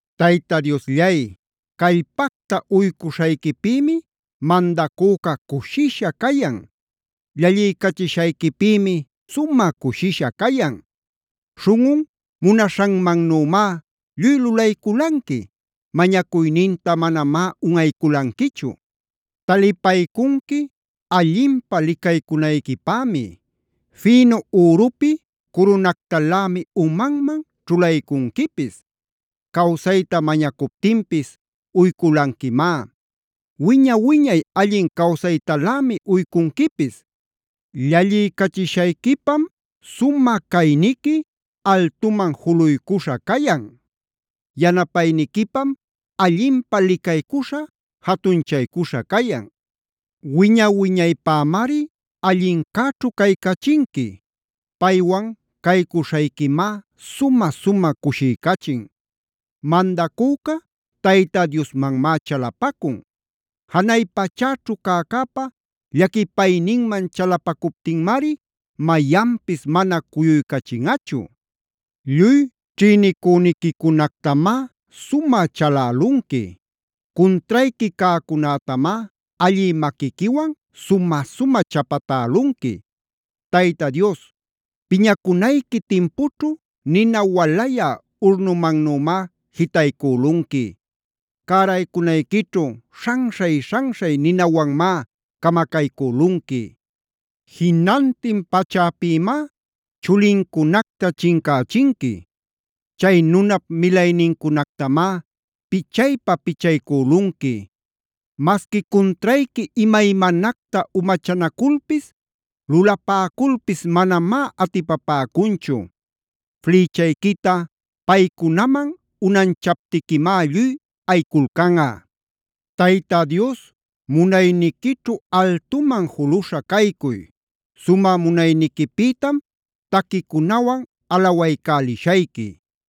Tayta Diosllay, callpacta uycuśhayquipïmi mandacüca cushisha cayan. Llalliycachishayquipïmi sumä cushisha cayan. Śhunꞌun munaśhanmannümá lluy lulayculanqui. Mañacuyninta manamá unꞌayculanquichu. Talipaycunqui allinpä licaycunayquipämi. Fïnu ürupi curunactalämi umanman ćhulaycunquipis. Cawsayta mañacuptinpis uyculanquimá. Wiña-wiñay allin cawsaytalämi uycunquipis. Llalliycachishayquipam sumä cayniqui altuman juluycuśha cayan. Yanapayniquipam allinpä licaycuśha, jatunchaycuśha cayan. Wiña-wiñaypämari allincäćhu caycachinqui. Paywan caycuśhayquimá sumä-sumä cushiycachin. Mandacüca Tayta Diosmanmá chalapacun. Janay pachäćhu cäcäpa llaquipayninman chalapacuptinmari mayanpis mana cuyuycachinꞌachu. Lluy ćhïnicüniquicunactamá sumä chalälunqui. Cuntrayqui cäcunätamá allï maquiquiwan sumä-sumä chapatälunqui. Tayta Dios, piñacunayqui timpućhu nina walayä urnumannümá jitaycülunqui. Cäraycunayquićhu śhanśhay-śhanśhay ninawanmá camacaycülunqui. Jinantin pachäpïmá chulincunacta chincächinqui. Chay nunap milaynincunactamá pichaypa-pichaycülunqui. Masqui cuntrayqui imaymanacta umachanaculpis, lulapäculpis manamá atipapäcunchu. Flïchayquita paycunaman unanchaptiquimá lluy ayiculcanꞌa. ¡Tayta Dios munayniquićhu altuman juluśha caycuy! ¡Sumä munayniquipïtam taquicunawan alawaycälishayqui!